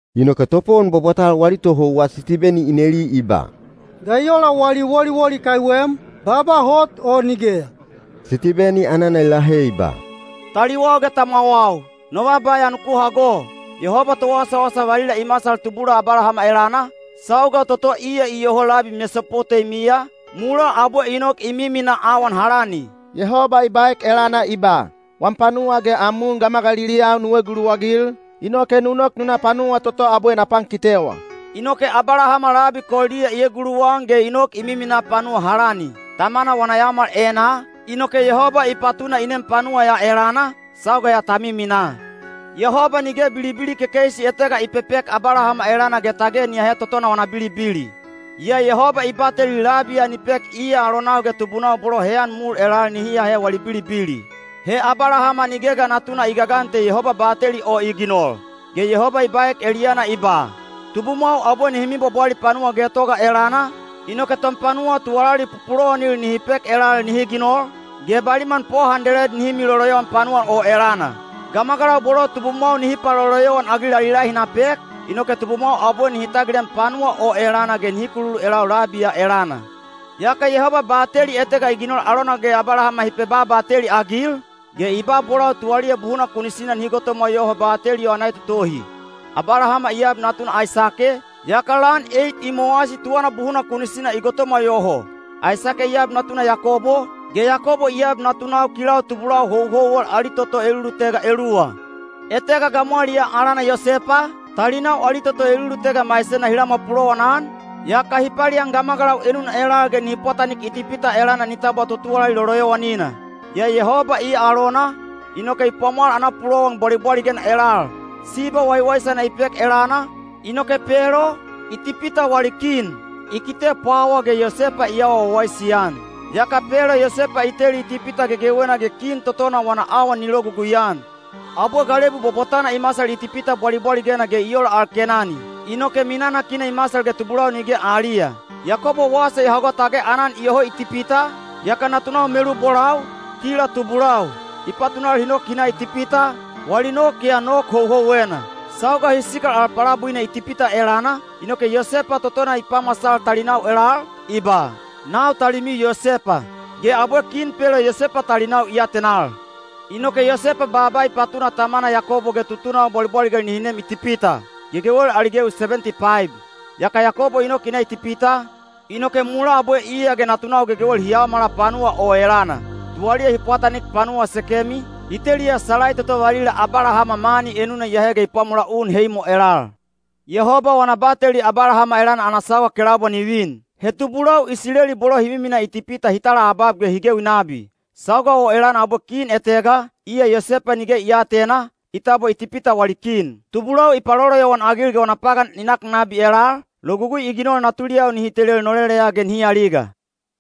Inoke topowon bwabwatal wali tohouwa Sitibeni i neli i ba, “Ga i ola wali woliwoli kaiwem, baaba hot o nigeya?” Sitibeni anana i lahe i ba, “Taliwau ge tamwawau, no baaba ya nuku hago. Yehoba Towasawasa valila i masal tubula Abalahama elana, sauga toto iya iyoho labi Mesopoteimiya, mulaa abwe i nok i miminaa awan Halani. Yehoba i baek elana i ba, ‘Wam panuwa ge am un gamagaliliyau nu eguluwagil, inoke nu nok nu na panuwa toto abwe na pankitewa.’ Inoke Abalahama labi Koldiya i eguluwan ge i nok i miminaa panuwa Halani. Tamana wana yaomal enaa, inoke Yehoba i patuna i nem panuwa ya elana, sauga ya ta miminaa. Yehoba nige bilibili kekeisi etega i pepek Abalahama elana ge tage ni ahe totona wana bilibili. Yaa Yehoba i bateli labi ya ni pek iya alonau ge tubunau bolo heyan mul elal nihi ahe wali bilibili. He Abalahama nige ga natuna i gagan te Yehoba bateli o i ginol. Ge Yehoba i baek eliyana i ba, ‘Tubumwau abwe nihi mibwabwali panuwa getoga elana, inoke tonpanuwa tuwalali pupulowanil nihi pek elal nihi ginol, ge baliman po handeled nihi miloloyowan panuwa o elana. Gamagalau bolo tubumwau nihi paloloyowan-agil ali lahi na pek, inoke tubumwau abwe nihi tagilem panuwa o elana ge nihi kululu elau labi ya elana.’ Yaka Yehoba bateli etega i ginol alona ge Abalahama hi pebabateli-agil, ge i ba bolau tuwaliya buhuna kunisina nihi gotomwa yoho bateli o ana etotohi. Abalahama i ab natuna Aisake, yaka lan eit i mowasi tuwana buhuna kunisina i gotomwa yoho. Aisake i ab natuna Yakobo, ge Yakobo i ab natunau kilau tubulau houhouwel ali toto elulutega eluwa. Etega gamwaliyaa alana Yosepa, talinau ali toto elulutega maisena hi lamwa pulowanan, yaka hi palian gamagalau enuna elal ge hi pwatanik Itipita elana i tabwa totuwalali loloyowanina. Yaa Yehoba iya alona, inoke i pwamwal ana pulowan bwalibwaligena elal. Siba waiwaisana i pek elana, inoke Pelo, Itipita wali kin, i kite pwawa ge Yosepa i awa wawaisi-an. Yaka Pelo Yosepa i teli Itipita gegewena ge kin totona wana awan ni logugui-an. Abwe galebu bwabwatana i masal Itipita bwalibwaligena ge i ola al Kenani, inoke minanakina i masal ge tubulau nige aliya. Yakobo wasa i hago tage aanan iyoho Itipita, yaka natunau melubolau, kila tubulau, i patunal hi nok hi na Itipita, wali nok ya nok houhouwena. Sauga hi sikal al palabuina Itipita elana, inoke Yosepa totona i pamasal talinau elal, i ba, ‘Nau talimiu Yosepa,’ ge abwe kin Pelo Yosepa talinau i atenal. Inoke Yosepa baaba i patuna tamana Yakobo ge tutunau bwalibwaligel nihi nem Itipita, gegewel ali gewi sebenti paib. Yaka Yakobo i nok i na Itipita, inoke mulaa abwe iya ge natunau gegewel hi yaomala panuwa o elana. Tuwaliya hi pwatanik panuwa Sekemi, hi teliya salai toto valila Abalahama mani enuna i ahe ge i pwamola un Heimo elal. Yehoba wana bateli Abalahama elana ana sauga kelaubwa ni vin, he tubulau Isileli bolo hi miminaa Itipita hi talaabab ge hi gewi nabi. Sauga o elana abwe kin etega, iya Yosepa nige i aatena, i tabwa Itipita wali kin. Tubulau i paloloyowan-agil ge wana pagan i nak nabi elal, logugui i ginol natuliyau nihi telel noleleya ge nihi aliga.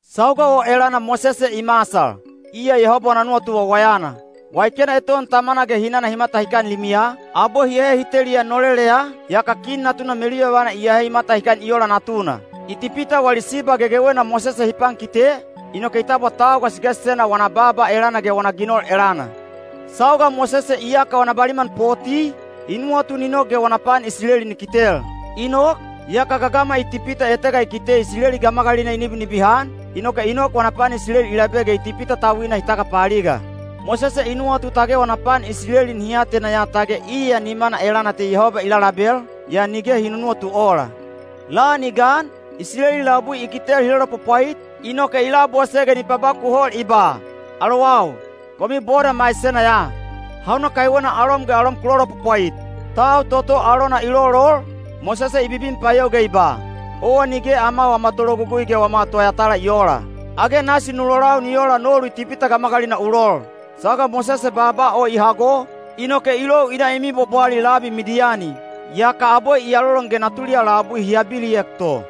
Sauga o elana Mosese i masal, iya Yehoba wana nuwatu wawayana. Waikena eton tamana ge hinana hi matahikan limiya, abwe hi ahe hi teliya noleleya, yaka kin natuna meluyovana i ahe i matahikan i ola natuna. Itipita wali siba gegewena Mosese hi pankite, inoke i tabwa tau gasigasisena wana baaba elana ge wana ginol elana. Sauga Mosese iyaka wana baliman poti, i nuwatu ni nok ge wana pan Isileli ni kitel. I nok, yaka gagama Itipita etega i kite Isileli gamagalina i nibinibihan, inoke i nok wana pan Isileli i labe ge Itipita tauina i tagapaaliga. Mosese i nuwatu tage wana pan Isileli nihi atena ya tage iya nimana elana te Yehoba i lalabel, yaa nige hi nunuwatu ola. Lan i gan, Isileli labui i kitel hi lolopwapwait, inoke i labose ge ni pabakuhol i ba, ‘Alowau! Komiu boda maisena ya. Hauna kaiwena alom ge alom ku lolopwapwait?’ Tau toto alona i lolol, Mosese i bibin payou ge i ba, ‘Owa nige ama wama tologugui ge wama toyatala i oola. Age nasi nu lolau ni ola nolu Itipita gamagalina u lol?’ Sauga Mosese baaba o i hago, inoke i lou i na i mibwabwali labi Midiyani. Yaka abwe i alolon ge natuliyau labui hi abiliek to.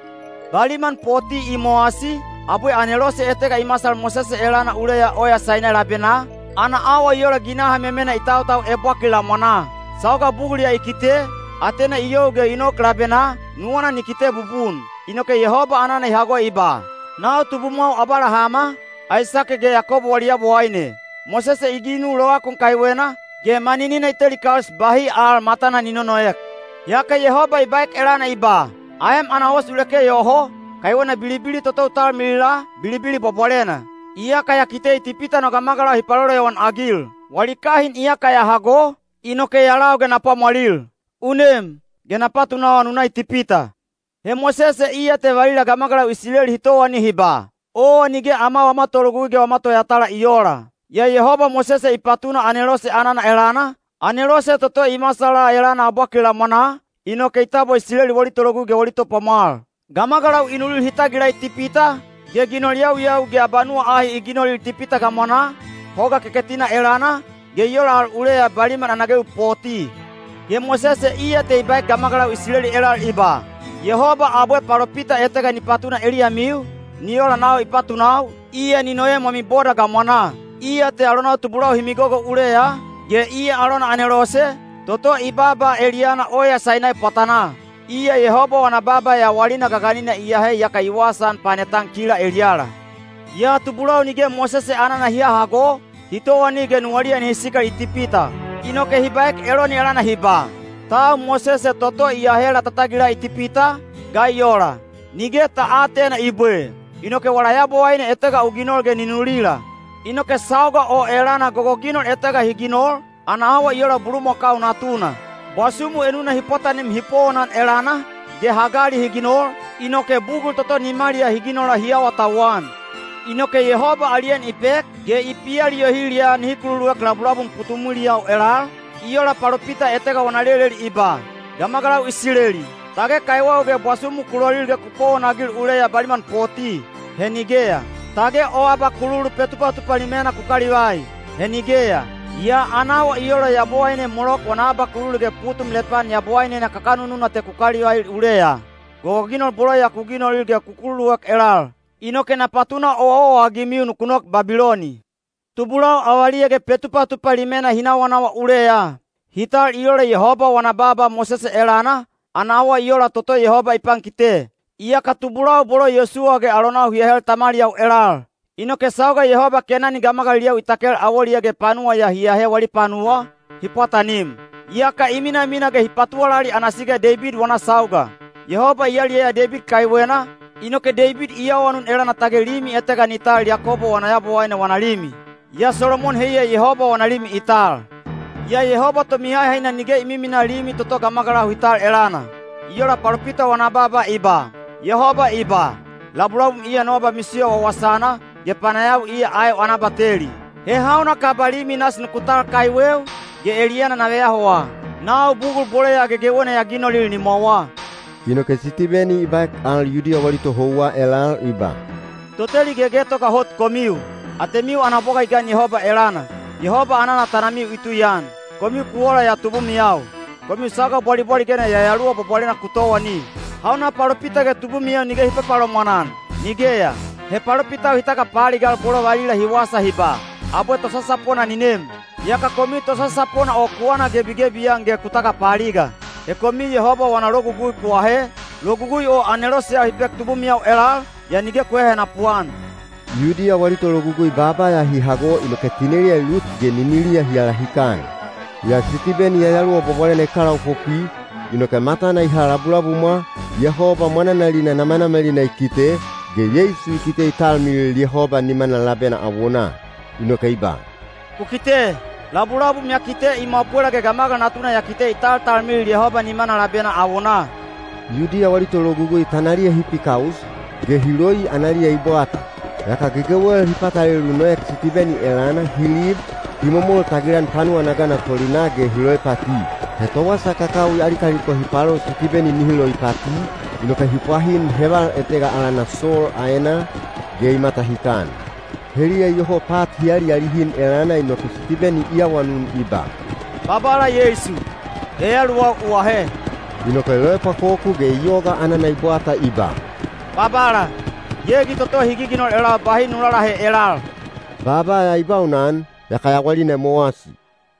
Baliman poti i mowasi, abwe anelose etega i masal Mosese elana uleya oya Sainai labenaa, ana awa i ola ginaha memena i tautau ebwakil lamwanaa. Sauga bugul ya i kite, atena i you ge i nok labenaa, nuwana ni kite bubun. Inoke Yehoba anana i hago i ba, ‘Nau tubumwau Abalahama, Aisake ge Yakobo wali Yabowaine.’ Mosese i ginu lovakun kaiwena, ge maninina i teli kaus bahi al matana ni nonoek. Yaka Yehoba i baek elana i ba, ‘Aem ana os u leke yoho, kaiwena bilibili toto u talmilila, bilibili bwabwalena. Iyaka ya kite Itipita no gamagalau hi paloloyowan-agil. Wali kahin iyaka ya hago, inoke ya lau ge na pwamwalil. U nem, ge na patunawa nu na Itipita.’ He Mosese iya te valila gamagalau Isileli hi towani hi ba, ‘Owa nige ama wama tologugui ge wama toyatala i oola.’ Yaa Yehoba Mosese i patuna anelose anana elana, anelose toto i masala elana ebwakil lamwanaa, inoke i tabwa Isileli wali tologugui ge wali topwamwal. Gamagalau i nulil hi tagila Itipita, ge ginol yawiyawi ge abanuwa ahi i ginolil Itipita gamwanaa, Hoga Keketina elana, ge i ola al uleya baliman ana gewi poti. Ge Mosese iya te i baek gamagalau Isileli elal i ba, ‘Yehoba abwe palopita etega ni patuna eliyamiu, ni ola nau i patunau, iya ni noem wami boda gamwanaa.’ Iya te alonau tubulau hi migogo uleya, ge iya alona anelose, toto i baaba eliyana oya Sainai pwatanaa. Iya Yehoba wana baaba yawalina gaganina i ahe yaka i wasaan panetan kila eliyala. Yaa tubulau nige Mosese anana hi hahago, hi towani ge nuwaliya nihi sikal Itipita. Inoke hi baek Eloni elana hi ba, ‘Tau Mosese toto i ahela ta tagila Itipita, ga i ola? Nige ta aatena i bwe. Inoke wala yabowaine etega u ginol ge ni nulila.’ Inoke sauga o elana gogoginol etega hi ginol, ana awa i ola bulumakau natuna. Bwasumu enuna hi pwatanim hi powonan elana, ge hagali hi ginol, inoke bugul toto nimaliyaa hi ginola hi awatauwan. Inoke Yehoba ali en i pek, ge i pialiyohil ya nihi kululuek labulabum putumwiliyau elal, i ola palopita etega wana leleli i ba: Gamagalau Isileli! Tage kaiweu ge bwasumu ku lolil ge ku powonagil uleya baliman poti? He nigeya! Tage o abakululu Petupatupa Limena ku kalivai? He nigeya! Yaa ana awa i ola yabowaine Molok wana abakululu ge putum Lepan yabowainena kakanununa te ku kalivail uleya. Gogoginol bolo ya ku ginolil ge ku kululuek elal. Inoke na patuna owaowa-agimiu nuku nok Babiloni. Tubulau avaliya ge Petupatupa Limena hi nawanawa uleya. Hi tal i ola Yehoba wana baaba Mosese elana, ana awa i ola toto Yehoba i pankite. Yaka tubulau bolo Yosuwa ge alonau hi ahe tamaliyau elal. Inoke sauga Yehoba Kenani gamagaliliyau i takel awoliyaa ge panuwa ya hi ahe wali panuwa, hi pwatanim. Yaka i minamina ge hi patuwalali ana siga Deibid wana sauga. Yehoba i yaliyaya Deibid kaiwena, inoke Deibid i awanun elana tage limi etega ni tal Yakobo wana Yabowaine wana limi. Yaa Solomon heiya Yehoba wana limi i tal. Yaa Yehoba Tomihahaina nige i miminaa limi toto gamagalau hi tal elana. I ola palopita wana baaba i ba: Yehoba i ba, ‘Labulabum iya no abamisiyo wawasana, ge panayawi iya aeu ana abateli. He hauna kaba limi nasi nuku tal kaiweu, ge eliyana na veyahowa? Nau bugul bolo ya gegewena ya ginolil nimwawa.’” Inoke Sitibeni i baek al Yudiya wali tohouwa elal i ba, “Toteli gegetoga hot komiu! Atemiu ana bwaga i gan Yehoba elana! Yehoba anana tanamiu i tuian! Komiu ku ola ya tubumiyau: komiu sauga bwalibwaligena Yayaluwa Bwabwalena ku towani! Hauna palopita ge tubumiyau nige hi papalomwan-an? Nigeya! He palopitau hi tagapaaligal bolo valila hi wasa hi ba, ‘Abwe Tosasapona ni nem.’ Yaka komiu Tosasapona o ku anagebigebi-an ge ku tagapaaliga. He komiu Yehoba wana logugui ku ahe, logugui o aneloseyau hi pek tubumiyau elal, yaa nige ku hehenapu-an.” Yudiya wali tologugui baaba ya hi hago inoke tineliya i lut ge niniliya hi alahikan. Yaa Sitibeni Yayaluwa Bwabwalena i kalaopopwi, inoke matana i ha labulabumwa, Yehoba mwananalina namanamalina i kite, ge Yeisu i kite i talmilil Yehoba nimana labena awonaa. Inoke i ba, “Ku kite! Labulabum ya kite i mwapwela ge Gamagal Natuna ya kite i taltalmilil Yehoba nimana labena awonaa.” Yudiya wali tologugui tanaliya hi pikaus, ge hi loi analiya i bwata. Yaka gegewel hi patalelu noek Sitibeni elana, hi lib, hi momol tagilan panuwa ana gana tolinaa ge hi loipati. He towasa kakawi ali kaliko hi palo Sitibeni nihi loipati, inoke hi pwahin heval etega alana Sol aenaa, ge i matahikan. Heliya iyoho pat hi alialihin elana inoke Sitibeni i awanun i ba, “Babala Yeisu, yayaluwau u ahe.” Inoke i loepwakoku ge i yoga anana i bwata i ba, “Babala, gegi toto hi giginol elau bahi nu lalahe elal.” Baaba ya i baunan, yaka yawalina i mowasi.